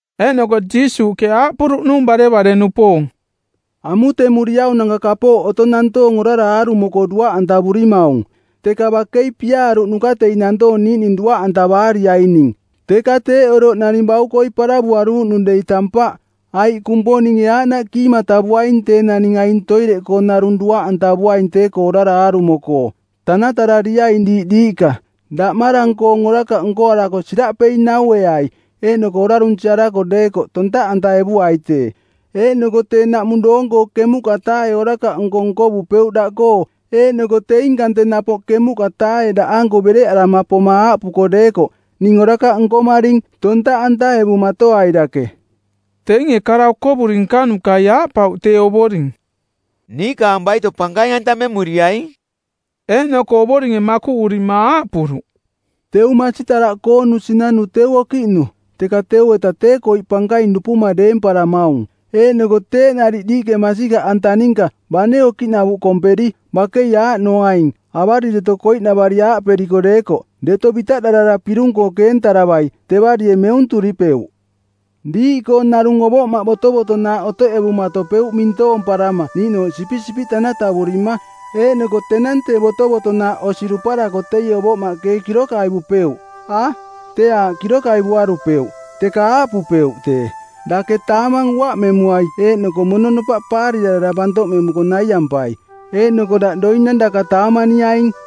Eeꞌnoko Jiisuuꞌke aaꞌpuruꞌnung barevare-nupoong, “Amutemuriaunanka kapooꞌ otong nantoong orara aarumo-koo duaꞌantavurimaung, teka bakei piaaruꞌnuka teing nantoong niiꞌning duaꞌantavaariaining. Teka teeꞌ oroꞌ naning baukoi paravuaruuꞌnung dei tampaꞌ, aiꞌ Kumponinge aaꞌnaꞌ kiimatavuaing tee naning aing toireꞌkoo narung duaꞌantavuaing tee-koo orara aarumo-koo. Tanatarariaing diiꞌ diiꞌka. Daꞌmarang-koong orakaꞌ nkoarako siraꞌpei naueai eeꞌnoko orarunsiarako deekoꞌ tontaꞌantaevuai tee. Eeꞌnoko tee naꞌmung doong-koo ˜kemuꞌka-taae orakaꞌnko nkovupeuꞌ daꞌkoo eeꞌnoko teing kante napoꞌ ˜kemuꞌka-taae daꞌanko bereꞌarama poma aaꞌpuko deekoꞌ, ‘Ning orakaꞌ nkomaring,’ tontaꞌantaevumatoai dake.” Teinge kara okovuri nkanukai aaꞌpauꞌ tee Ovoring, “Niikaang baito pankaing-antamemuriaing.” Eeꞌnoko Ovoringe makuꞌurima aaꞌpuruꞌ, “Teu masitaraꞌkoonu sinanu teu okiꞌnu, teka teu-eta tee koiꞌ pankaing dupuma deemparamaung, eeꞌnoko teeꞌ nariꞌ diiꞌke masikaꞌanta ninka, bane okiꞌnavuꞌ komperi, bakei aaꞌnoaing, avarireto koiꞌnavari aaꞌperiko deekoꞌ, ‘Deto bitaꞌdarara pirung-koo keentaravai,’ tevarie meunturipeuꞌ. “Diiꞌkoo narung ovoꞌmaꞌ botovotonaaꞌ otoꞌevumatopeuꞌ mintoomparama niiꞌnooꞌ sipisipiꞌ tanatavurima, eeꞌnoko tenang tee botovotonaaꞌ osi duparako teie ovoꞌmaꞌke ee kirokaivupeuꞌ? A, teeꞌ aaꞌ kirokaivuarupeuꞌ, teka aaꞌpupeuꞌ tee, ‘Dake taamang uaꞌmemuai eeꞌnoko mononopaꞌ paarirarara bantoꞌmemuko naiampai eeꞌnoko daꞌ doinang daka taamaniaing.’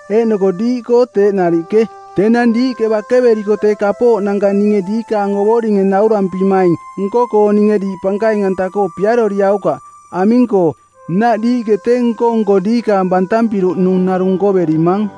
Eeꞌnoko diiꞌkoo teeꞌ nariꞌke, tenang diiꞌke bakeveriko tee kapooꞌnanka ninge diikaang ovoringe naurampimaing nko-koo ninge diiꞌ pankaing-anta-koo piaroriaukaꞌ, aming-koo, nnaꞌ diiꞌke tee nko-nko diikaang bantampiruꞌnung narung nkoverimang.”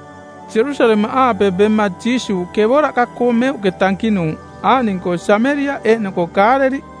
Jerusalemaꞌaape bema Jiisuuꞌ kevoraꞌka-koo meuꞌke tankinuuꞌ aaꞌning-koo Sameriaꞌ eeꞌnoko Kaaleliꞌ.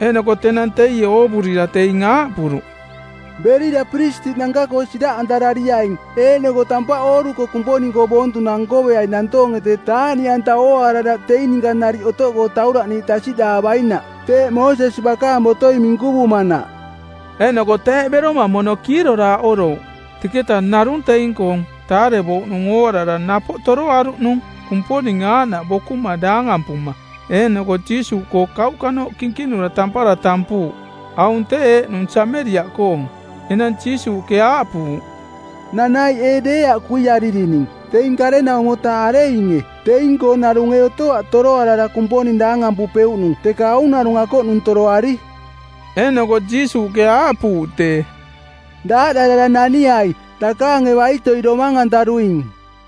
Eeꞌnoko tenang teie oovurira teing aaꞌpuruꞌ, “Berira piristiꞌnanka-koo siraꞌantarariaing, eeꞌnoko tampaꞌ ooruko Kumponing-koo boontunang nkoveai nantoonge tee taaꞌniꞌanta ooaara daꞌ teing ninka nariꞌ otoꞌkoo tauraꞌniiꞌ tasiꞌdaavainaꞌ, teeꞌ Moosesi bakaang botoi minkuvumanaꞌ.” Eeꞌnoko teeꞌ beroma mono kiiroraaꞌorouꞌ. Teketa narung teing-koong taarevouꞌnung ooarara napoꞌ toroaruꞌnung Kumponing aaꞌnaꞌ bokuma daangampuma. Eeꞌnoko Jiisuuꞌkoo kauꞌkanooꞌ kinkinura tampara tampuuꞌ. Aung tee eeꞌnung Sameriaꞌkoong. Enang Jiisuuꞌke aaꞌpuuꞌ, “Nanaiꞌ ee deeaꞌ kuiaririning? Teing ˜karenaumo-taa areinge? Teing-koo narung ee otoaꞌ toroarara Kumponing daangampupeuꞌnung teka aung narung akoꞌnung toroari?” Eeꞌnoko Jiisuuꞌke aaꞌpuuꞌ tee, “Daaꞌdarara naniai. Dakaange baitoi domang-antaruing.”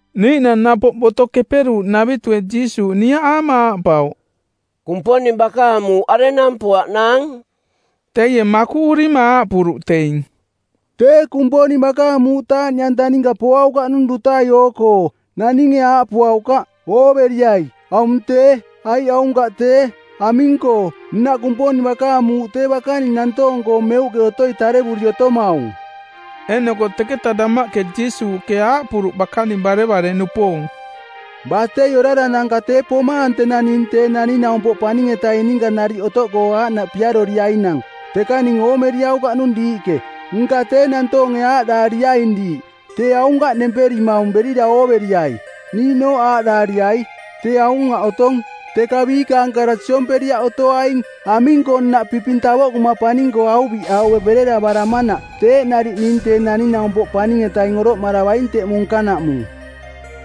Niiꞌnang napoꞌ Boto Keperuuꞌnavitue Jiisuuꞌ niaꞌaama aaꞌpauꞌ, “Kumponing bakaang muuꞌ arenang poaꞌnaang?” Teie makuꞌurima aaꞌpuruꞌ teing, “Tee Kumponing bakaang muuꞌ taaꞌniꞌanta ninka poaukaꞌnung dutai oo-koo. Naninge aaꞌpuaukaꞌ, ‘Ooveriai, aung tee,’ aiꞌ ‘Aunkaꞌ tee.’ Aming-koo, nnaꞌ Kumponing bakaang muuꞌ tee bakaning nantoong-koo meuꞌke otoi tarevuri otomaung.” Eeꞌnoko teketa damaꞌke Jiisuuꞌke aaꞌpuruꞌ bakaning barevare-nupoong, “Batei orananka tee pomaang tenang ning Tee Naning-naumpoꞌ Paning-etaing ninka nariꞌ otoꞌkoo aaꞌnaꞌ piaroriainang, teka ning oomeriaukaꞌnung diiꞌke. Nka tee nantoonge aaꞌdaariaing diiꞌ, ‘Tee aunkaꞌ nemperimaung berira ooveriai.’ Niiꞌnooꞌ aaꞌdaariai, ‘Tee aung aꞌ otong.’ Teka biikaang kara siomperiaꞌ otoaing. Aming-koo nnaꞌ piping tavoꞌkuma paning-koo auviꞌaue bereravaramanaꞌ teeꞌ nariꞌ ning Tee Naning-naumpoꞌ Paning-etaing oroꞌmaravaing teꞌmung nkanaꞌmung.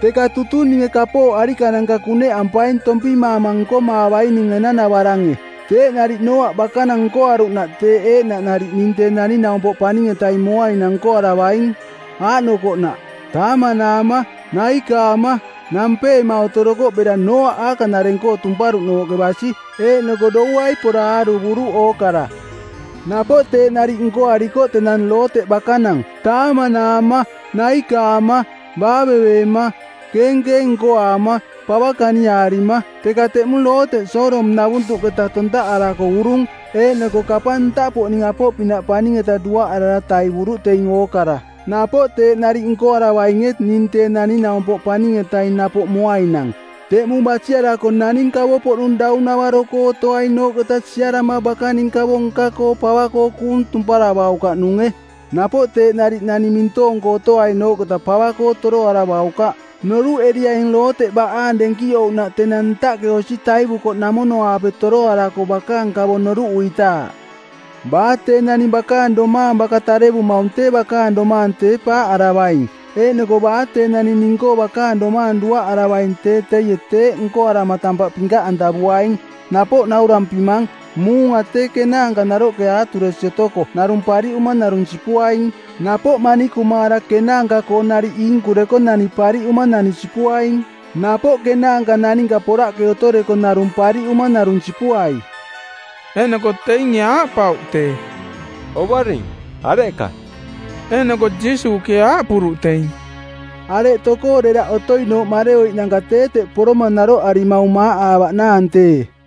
Teka tutung ninge kapooꞌ arikananka kuneꞌampaing tompimaama nkomaavaining enanavarange. “Teeꞌ nariꞌ Nooaꞌ bakanang nkoaruꞌnaꞌ teeꞌ eeꞌnaꞌ nariꞌ ning Tee Naning-naumpoꞌ Paning-etaing moainang nkoaravaing. Aaꞌnokoꞌnaꞌ: Taamanaama, naikaama, nampeema otorokoꞌ bera Nooaꞌ aakaꞌnareng-koo tumparuꞌnooꞌke basi, eeꞌnoko douai pora aaruvuruꞌ ookara. Napoꞌ teeꞌ nariꞌ nkoarikoꞌ tenang Looteꞌ bakanang: Taamanaama, naikaama, baaveveema, keenkeeng nkoaama, pava kaniaarima. Teka teꞌmung Looteꞌ Sodom-navuntuꞌketa tontaꞌarako urung eeꞌnoko kapang ntaꞌpoꞌning apoꞌpinaꞌ paning-eta duaꞌarara taivuruꞌ teing ookara. “Napoꞌ teeꞌ nariꞌ nkoaravainge ning Tee Naning-naumpoꞌ Paning-etaing napoꞌ moainang. Teꞌmung basiarako naning kavo-poꞌnung daunavaro-koo otoainooꞌketa siarama bakaning kavo nka-koo pava-koo kuung tumparavaukaꞌnunge. Napoꞌ teeꞌ nariꞌ naning mintoong-koo otoainooꞌketa pava-koo toroaravaukaꞌ. Noruꞌeriaing Looteꞌ baꞌaang denkiꞌouꞌnaꞌ tenang ntaꞌke osi taivukoꞌnamono-aape toroarako bakaang kavo noruꞌuitaaꞌ. “Baa tee naning bakaang domaang baka tarearamaung tee bakaang domaang tee paaꞌaravaing, eeꞌnoko baa tee naning ning-koo bakaang domaang duaꞌaravaing tee teie teeꞌ nkoarama tampaꞌ pinkaꞌantavuaing. Napoꞌ naurampimang, muunga tee kenaanka naroꞌke aaturesi otoko narung pariꞌuma narung sipuaing. Napoꞌ manikumaara kenaanka-koo nariꞌ iinkureko nani pariꞌuma nani sipuaing. Napoꞌ kenaanka naninka poraꞌke otoreko narung pariꞌuma narung sipuai.” Eeꞌnoko teinge aaꞌpauꞌ tee, “Ovoring, areꞌka?” Eeꞌnoko Jiisuuꞌke aaꞌpuruꞌ teing, “Areꞌ tokoo deraꞌ otoinooꞌ mareoiꞌnanka tee teꞌ poroma naroꞌarimaung maaꞌaavaꞌnaang tee.”